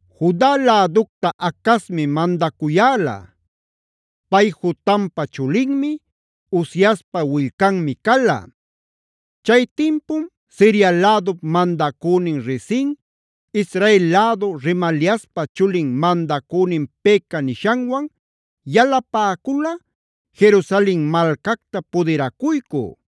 Juda läducta Acazmi mandacuyäla. Pay Jotampa chulinmi, Uziaspa willcanmi cala. Chay tinpum Siria lädup mandacünin Rezin, Israel lädu Remaliaspa chulin mandacünin Peka nishanwan yalapäcula, Jerusalen malcacta pudiracuycü.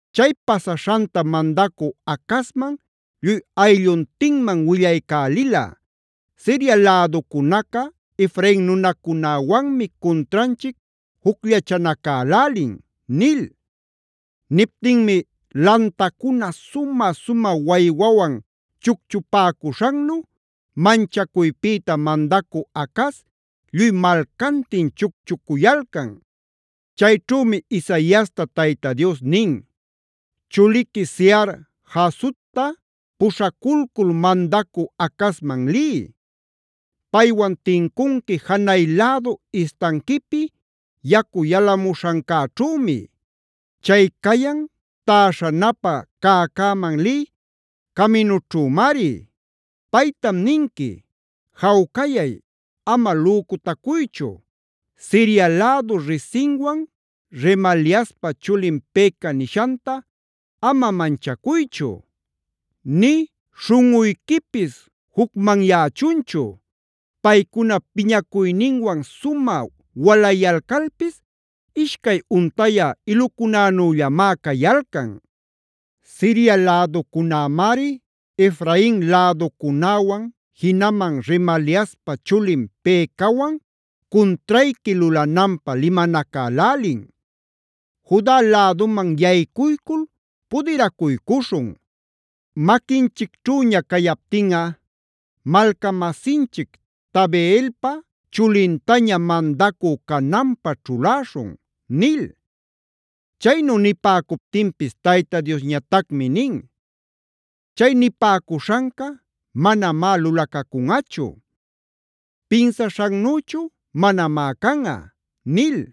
Chay pasaśhantam mandacü Acazman lluy aylluntinman willaycälila: “Siria läducunaca Efrain nunacunäwanmi cuntranchic jucllachanacälälin” nil. Niptinmi lantacuna sumä-sumä waywawan chucchupäcuśhannu manchacuypïta mandacü Acaz lluy malcantin chucchucuyalcan. Chayćhümi Isaiasta Tayta Dios nin: “Chuliqui Sear-jasubtab puśhaculcul mandacü Acazman liy. Paywan tincunqui janay lädu istanquipi yacu yalamuśhancäćhümi. Chay cayan täśhanapä cäcäman lï caminućhümari. Paytam ninqui: ‘Jawcayay, ama lücutacuychu. Siria lädu Rezinwan Remaliaspa chulin Peka nishanta ama manchacuychu nï śhunꞌuyquipis jucmanyächunchu. Paycuna piñacuyninwan sumä walayalcalpis, ishcay untayä ilucunänüllamá cayalcan. Siria läducunämari Efrain läducunäwan jinaman Remaliaspa chulin Pekawan cuntrayqui lulananpä limanacälälin: “Juda läduman yaycuycul pudiracuycuśhun. Maquinchicćhüña cayaptinꞌa malcamasinchic Tabeelpa chulintaña mandacü cananpä ćhuläśhun” nil. Chaynu nipäcuptinpis Tayta Diosñatacmi nin: “ ‘¡Chay nipäcuśhanca manamá lulacacunꞌachu; pinsaśhannüchu manamá canꞌa!’ nil.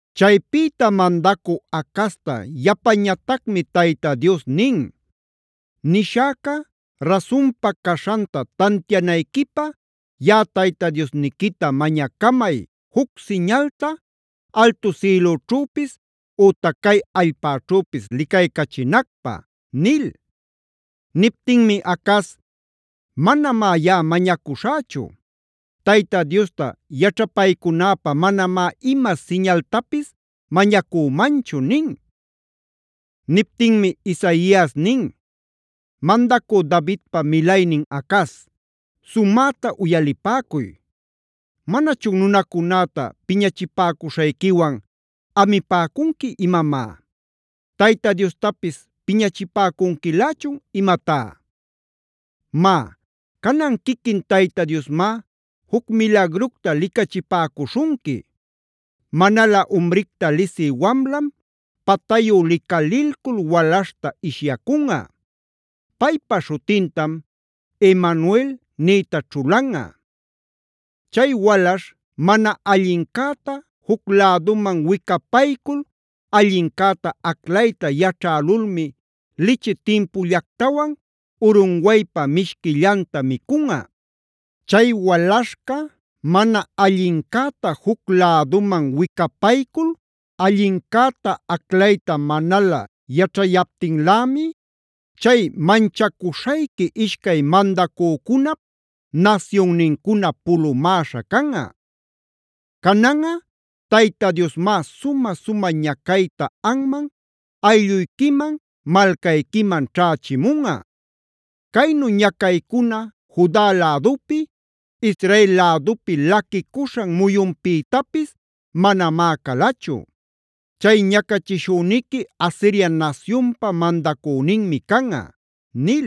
Chaypïta mandacü Acazta yapañatacmi Tayta Dios nin: “Nishäca rasunpa caśhanta tantianayquipä yaꞌa Tayta Diosniquita mañacamay juc siñalta altu sïlüćhüpis ütac cay allpäćhüpis licaycachinacpä” nil. Niptinmi Acaz: “Manamá yaꞌa mañacuśhächu; Tayta Diosta yaćhapaycunäpä manamá ima siñaltapis mañacümanchu” nin. Niptinmi Isaias nin: “Mandacü Davidpa milaynin Acaz, sumäta uyalipäcuy. ¿Manachun nunacunäta piñachipäcuśhayquiwan amipäcunqui imamá? ¿Tayta Diostapis piñachipäcunquilächun imatá? Má, canan quiquin Tayta Diosmá juc milagructa licachipäcuśhunqui. Manalä umricta lisï wamlam, patayu licalilcul walaśhta ishyacunꞌa. Paypa śhutintam Emanuelc nïta ćhulanꞌa. Chay walaśh mana allincäta juc läduman wicapaycul allincäta aclayta yaćhälulmi lichi timpullactawan urunwaypa mishquillanta micunꞌa. Chay walaśhca mana allincäta juc läduman wicapaycul allincäta aclayta manalä yaćhayaptinlämi, chay manchacuśhayqui ishcay mandacücunap nasyunnincuna pulumäśha canꞌa. “Cananꞌa Tayta Diosmá sumä-sumä ñacayta anman, aylluyquiman, malcayquiman ćhächimunꞌa. Caynu ñacaycuna Juda lädupi, Israeld lädupi laquicuśhan muyunpïtapis manamá calachu. (Chay ñacachishüniqui Asiria nasyunpa mandacüninmi canꞌa)” nil.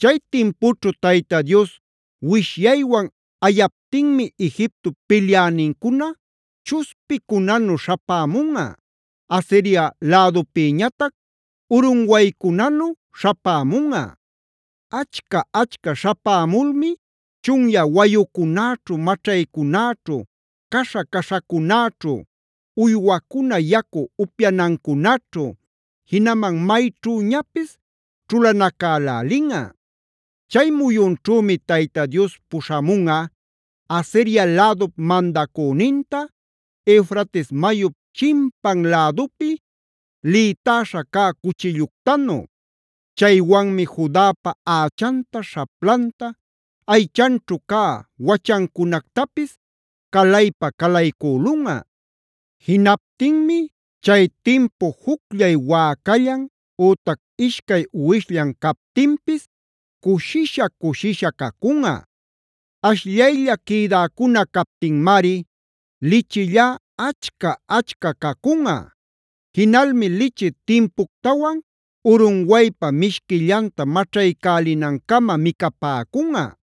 Chay timpućhu Tayta Dios wishyaywan ayaptinmi Egiptop pilyänincuna chuspicunanu śhapämunꞌa; Asiria lädupïñatac urunwaycunanu śhapämunꞌa. Achca-achca śhapämulmi chunyä wayucunäćhu, maćhaycunäćhu, caśha-caśhacunäćhu, uywacuna yacu upyanancunaćhu, jinaman mayćhüñapis ćhulanacälälinꞌa. Chay muyunćhümi Tayta Dios puśhamunꞌa Asiria lädup mandacüninta Eufrates mayup chimpan lädupi lïtaśha cä cuchilluctanu. Chaywanmi Judapa ächanta, śhaplanta, aychanćhu cä wachancunactapis calaypa-calaycülunꞌa. Jinaptinmi chay timpu jucllay wäcallan, ütac ishcay uwishllan captinpis cushisha-cushisha cacunꞌa. Ashllaylla quïdäcuna captinmari lichillá achca-achca cacunꞌa. Jinalmi lichi timpuctawan urunwaypa mishquillanta maćhaycälinancama micapäcunꞌa.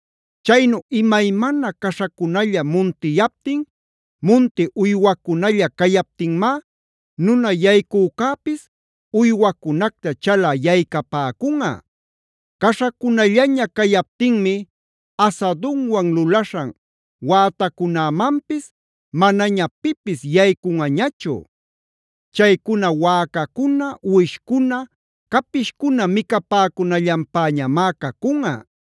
Chaynu imaymana caśhacunalla muntiyaptin, munti uywacunalla cayaptinmá, nuna yaycücäpis uywacunacta chalä yaycapäcunꞌa. Caśhacunallaña cayaptinmi asadunwan lulaśhan wätacunämanpis manaña pipis yaycunꞌañachu. Chaycuna wäcacuna, uwishcuna, capishcuna micapäcunallanpäñamá cacunꞌa.